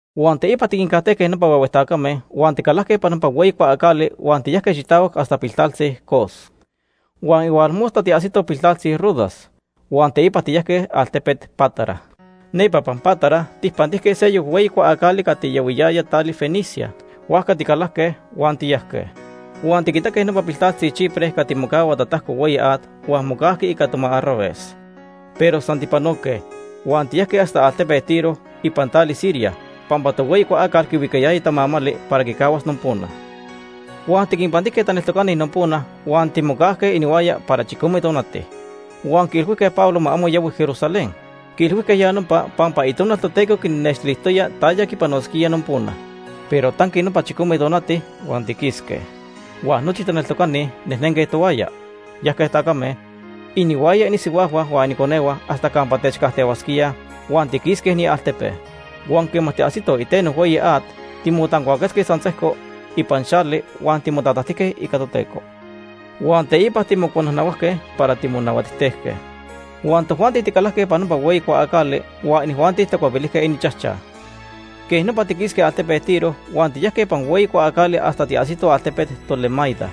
Huan teipa tiquincajtejque nopa huehue tacame huan ticalajque ipan nopa hueyi cuaacali huan tiyajque xitahuac hasta piltaltzi Cos. Huan tonili tiajsitoj piltaltzi Rodas huan teipa tiyajque altepet Pátara. Nepa ipan Pátara tijpantijque seyoc hueyi cuaacali cati yahuiyaya tali Fenicia. Huajca ticalajque huan tiyajque. Huan tiquitaque nopa piltaltzi Chipre cati mocahua tatajco hueyi at huan mocajqui ica toma arravez. Pero san tijpanoque huan tiyajque hasta altepet Tiro ipan tali Siria pampa tohueyi cuaacal quihuicayaya tamamali para quicahuas nopona. Huan tiquinpantijque taneltocani nopona huan timocajque inihuaya para chicome tonati. Huan quiilhuijque Pablo ma amo yahui Jerusalén. Quiilhuijque ya nopa pampa Itonal Toteco quinnextilijtoya taya quipanosquía nopona. Pero tanqui nopa chicome tonati huan tiquisque. Huan nochi taneltocani nejnenque tohuaya. Yajque tacame, inihuaya inisihuajhua, huan ininconehua hasta campa techcajtehuasquíaj huan tiquisque inialtepe. Huan quema tiajsitoj iteno hueyi at, timotancuaquetzque san sejco ipan xali huan timotatajtijque ica Toteco. Huan teipa timocuanajnahuajque para timonahuatijtejque. Huan tojuanti ticalajque ipan nopa hueyi cuaacali huan inijuanti tacuepilijque ininchajchaj. Quej nopa tiquisque altepet Tiro huan tiyajque ipan hueyi cuaacali hasta tiajsitoj altepet Tolemaida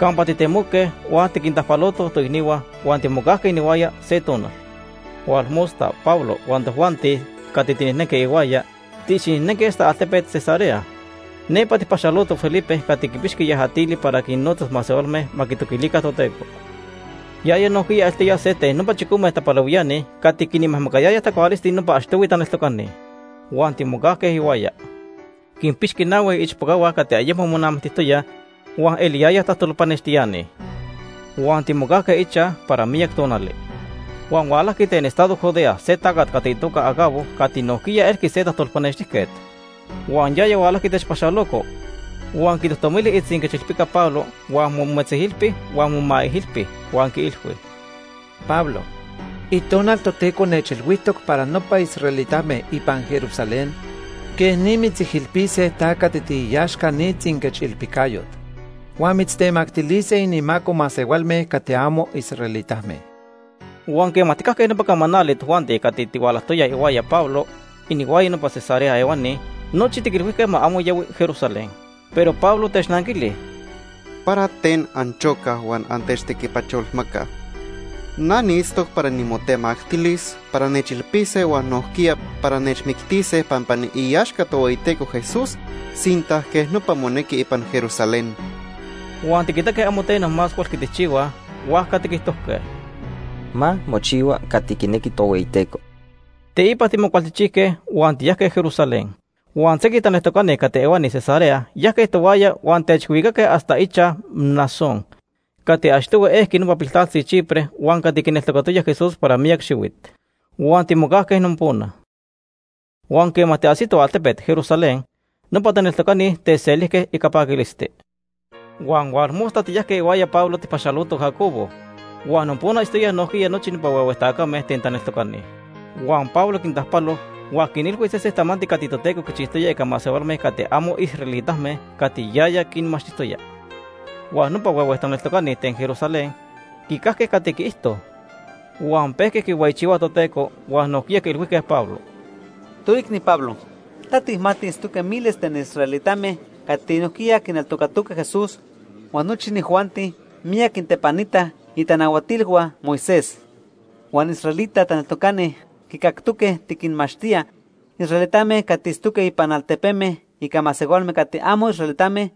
campa titemoque huan tiquintajpalotoj toicnihua huan timocajque inihuaya se tonal. Tonili Pablo huan tojuanti cati tinejnenque ihuaya tiicxinejnenque hasta altepet Cesarea. Nepa tijpaxalotoj Felipe cati quipixqui yajatili para quinnotza masehualme ma quitoquilica Toteco. Yaya nojquiya eltoya se ten nopa chicome tapalehuiani cati quinmajmacayayaj tacualisti nopa achtohui taneltocani. Huan timocajque ihuaya. Quinpixqui nahui iichpocahua cati ayemo monamictijtoyaj huan itztoyaj tajtolpanextiani. Huan timocajque ichaj para miyac tonali. Huan hualajqui ten estado Judea se tacat cati itoca Agabo cati nojquiya elqui se tajtolpanextijquet. Huan yaya hualajqui techpaxaloco, huan quitojtomili itzinquechilpica Pablo huan mometzijilpi huan momaijilpi huan quiilhui: ―Pablo, Itonal Toteco nechilhuijtoc para nopa israelitame ipan Jerusalén quej ni mitzijilpise ta cati tiiaxca ni tzinquechilpicayot. Huan mitztemactilise inimaco masehualme cati amo israelitame. Huan quema tijcajque nopa camanali, tojuanti cati tihualajtoyaj ihuaya Pablo, inihuaya nopa Cesarea ehuani, nochi tiquilhuijque ma amo yahui Jerusalén. Pero Pablo technanquili: ―¿Para ten anchocaj huan antechtequipacholmacaj? Na niitztoc para nimotemactilis para nechilpise huan nojquiya para nechmictise pampa niiaxca Tohueyiteco Jesús sinta quej nopa monequi ipan Jerusalén. Huan tiquitaque amo teno más huelqui tijchihuaj, huajca tiquijtojque: ―Ma mochihua cati quinequi Tohueyiteco. Teipa timocualchijchijque huan tiyajque Jerusalén. Huan sequij taneltocani cati ehuani Cesarea yajque tohuaya huan techhualicaque hasta ichaj Mnasón cati achtohui ejqui nopa piltaltzi Chipre huan cati quineltocatoya Jesús para miyac xihuit. Huan timocajque nopona. Huan quema tiajsitoj altepet Jerusalén, nopa taneltocani techselijque ica paquilisti. Huan tonili tiyajque ihuaya Pablo tijpaxalotoj Jacobo, huan nopona itztoyaj nojquiya nochi nopa huehue tacame ten taneltocani. Huan Pablo quintajpalo, huan quinilhui sesen tamanti cati Toteco quichijtoya ica masehualme cati amo israelitame cati yaya quinmachtijtoya. Huan nopa huehue taneltocani ten Jerusalén quicajque cati quiijto. Huan pejque quihueyichihuaj Toteco, huan nojquiya quiilhuijque Pablo: ―Toicni Pablo, ta tijmati itztoque miles ten israelitame cati nojquiya quineltocatoque Jesús, huan nochi inijuanti miyac quintepanitaj itanahuatilhua Moisés. Huan israelita taneltocani quicactoque tiquinmachtía israelitame cati itztoque ipan altepeme ica masehualme cati amo israelitame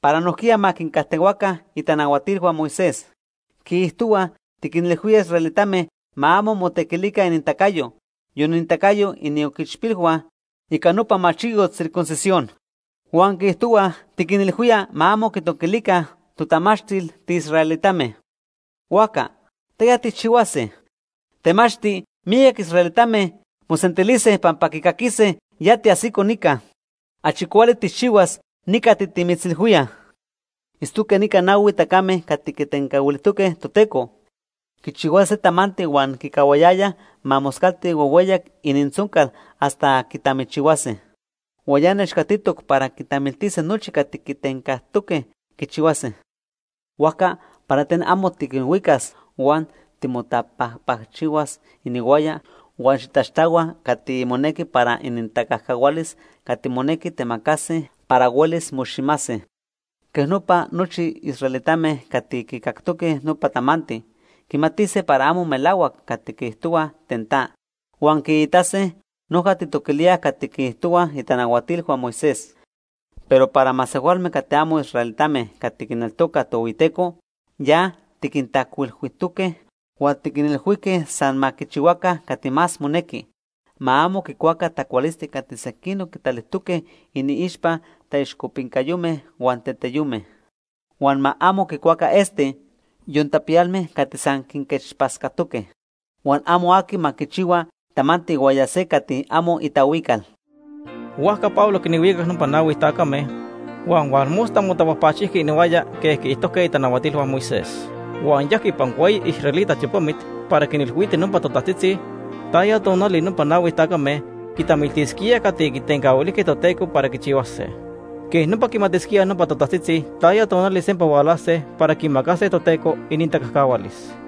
para nojquiya ma quincajtehuaca itanahuatilhua Moisés. Quiijtohuaj tiquinilhuía israelitame ma amo motequilica inintacayo, yon inintacayo inioquichpilhua, ica nopa machiyot circuncisión. Huan quiijtohuaj tiquinilhuía ma amo quitoquilica totamachtil tiisraelitame. Huajca ¿taya tijchihuase? Temachti miyac israelitame mosentilise pampa quicaquise ya tiajsico nica. Achi cuali tijchihuas ni cati timitzilhuíaj. Itztoque nica nahui tacame cati quitencahuilijtoque Toteco quichihuase se tamanti huan quicahuayayaj ma moscalti huehueyac inintzoncal hasta quitamichihuase. Huan ya nechcatitoc para quitamiltise nochi cati quitencajtoque quichihuase. Huajca para ten amo tiquinhuicas huan timotapajpacchihuas inihuaya huan xitaxtahua cati monequi para inintacajcahualis cati monequi temacase para huelis moximase. Quej nopa nochi israelitame cati quicactoque nopa tamanti, quimatise para amo melahuac cati quiijtohuaj ten ta. Huan quiitase noja tijtoquilía cati quiijtohuaj itanahuatilhua Moisés. Pero para masehualme cati amo israelitame cati quineltocaj Tohueyiteco, ya tiquintajcuilhuijtoque huan tiquinilhuijque san ma quichihuaca cati más monequi. Ma amo quicuaca tacualisti cati sequinoc quitalijtoque iniixpa taixcopincayome huan teteyome. Huan ma amo quicuaca esti, yon tapiyalme cati san quinquechpatzcatoque. Huan amo aqui ma quichihua tamanti ihuaya se cati amo itahuical. Huajca Pablo quinhuicac nopa nahui tacame huan tonili motapajpacchijqui inihuaya quej quiijtojque itanahuatilhua Moisés. Huan yajqui ipan hueyi israelita tiopamit para quinilhuiti nopa totajtzitzi taya tonali nopa nahui tacame quitamiltisquíaj cati quitencahuilijque Toteco para quichihuase. Quej nopa quimatisquíaj nopa totajtzitzi taya tonali sempa hualase para quimacase Toteco inintacajcahualis.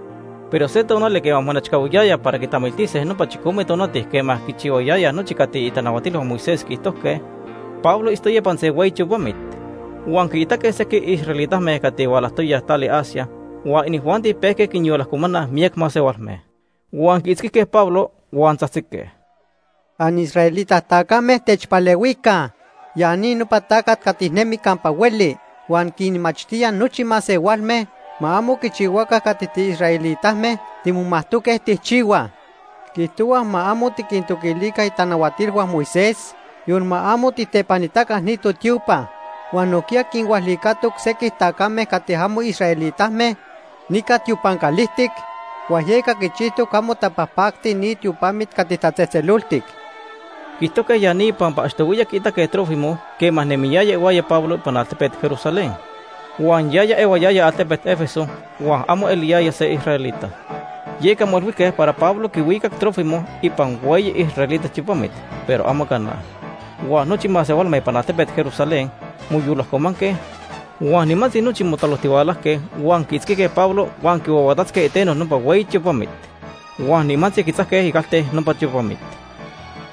Pero se tonali quema monechcahuiyaya para quitamiltise nopa chicome tonati quema quichihuayayaj nochi cati itanahuatilhua Moisés quiijtojque, Pablo itztoya ipan hueyi tiopamit. Huan quiitaque sequij israelitame cati hualajtoyaj tali Asia huan inijuanti pejque quinyolajcomanaj miyac masehualme. Huan quiitzquijque Pablo, huan tzajtzique: “Anisraelita tacame, techpalehuica. Ya ni nopa tacat cati nemi campa hueli huan quinmachtía nochi masehualme ma amo quichihuaca cati tiisraelitame timomajtoque tijchihuaj. Quiijtohua ma amo tiquintoquilica itanahuatilhua Moisés, yon ma amo tijtepanitaca ni totiopa. Huan nojquiya quinhualicatoc sequij tacame cati amo israelitame nica tiopan calijtic huan yeca quichijtoc amo tapajpacti ni tiopamit cati tatzejtzeloltic.” Quiijtojque ya ni pampa achtohuiya quiitaque Trófimo quema nemiyaya ihuaya Pablo ipan altepet Jerusalén. Huan yaya ehuayaya altepet Éfeso huan amo se israelita. Yeca moilhuijque para Pablo quihuicac Trófimo ipan hueyi israelita tiopamit, pero amo cana. Huan nochi masehualme ipan altepet Jerusalén moyolajcomanque huan nimantzi nochi motalojtihualajque huan quiitzquijque Pablo huan quihuahuatatzque iteno nopa hueyi tiopamit. Huan nimantzi quitzajque icalte nopa tiopamit.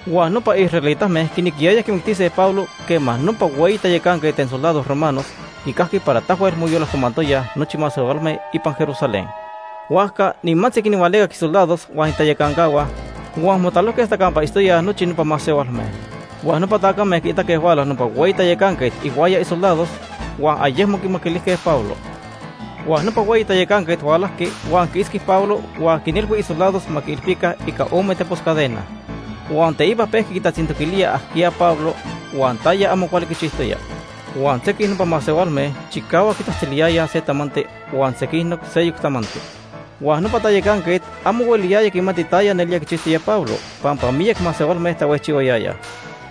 Huan nopa israelitame quinequiyayaj quimictise Pablo quema nopa hueyi tayacanquet ten soldados romanos quicajqui para tahuel moyolajcomantoyaj nochi masehualme ipan Jerusalén. Huajca nimantzi quinhualicac isoldados huan inintayacancahua huan motalojque hasta campa itztoyaj nochi nopa masehualme. Huan nopa tacame quiitaque huala nopa hueyi tayacanquet inihuaya isoldados huan ayecmo quimaquilijque Pablo. Huan nopa hueyi tayacanquet hualajqui huan quiitzqui Pablo huan quinilhui isoldados ma quiilpica ica ome tepos cadena. Huan teipa pejqui quitatzintoquilía ajquiya Pablo huan taya amo cuali quichijtoya. Huan sequij nopa masehualme chicahuac quitzajtziliyayaj se tamanti huan sequinoc seyoc tamanti. Huan nopa tayacanquet amo hueliyaya quimati taya nelía quichijtoya Pablo pampa miyac masehualme tahuejchihuayayaj.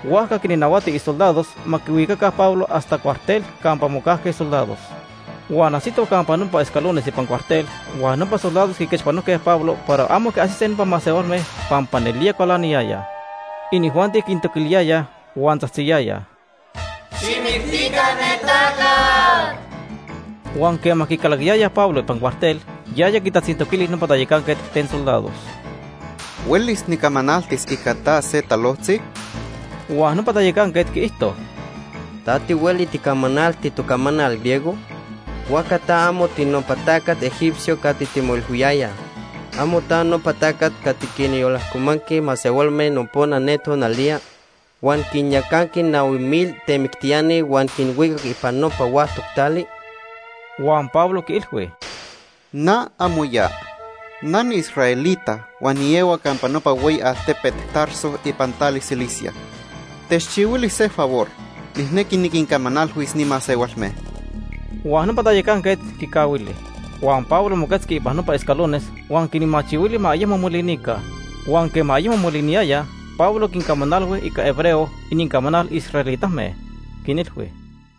Huajca quinnahuati isoldados ma quihuicaca Pablo hasta cuartel campa mocajque soldados. Huan ajsitoj campa nopa escalones ipan cuartel, huan nopa soldados quiquechpanojque Pablo para amo quiajsise nopa masehualme pampa nelía cualaniyayaj. Inijuanti quintoquiliyayaj huan tzajtziyayaj: “¡Xijmictica ne tacat!” Huan quema quicalaquiyayaj Pablo ipan cuartel, yaya quitatzintoquili nopa tayacanquet ten soldados: ―¿Huelis nicamanaltis ica ta se talojtzi? Huan nopa tayacanquet quiijto: ―¿Ta tihueli ticamanalti tocamanal, griego? Huajca ta amo tinopa tacat egipcio cati timoilhuiyayaj. ¿Amo ta nopa tacat cati quinyolajcomanqui masehualme nopona tonaliya, huan quinyacanqui nahui mil temictiani huan quinhuicac ipan nopa huactoc tali? Huan Pablo quiilhui: ―Na amo ya. Na niisraelita huan niehua campa nopa hueyi altepet Tarso ipan tali Cilicia. Techchihuili se favor, nijnequi niquincamanalhuis ni masehualme. Huan nopa tayacanquet quicahuili, huan Pablo moquetzqui ipan nopa escalones huan quinmachihuili ma ayecmo molinica. Huan quema ayecmo moliniyayaj, Pablo quincamanalhui ica hebreo, inincamanal israelitame. Quinilhui: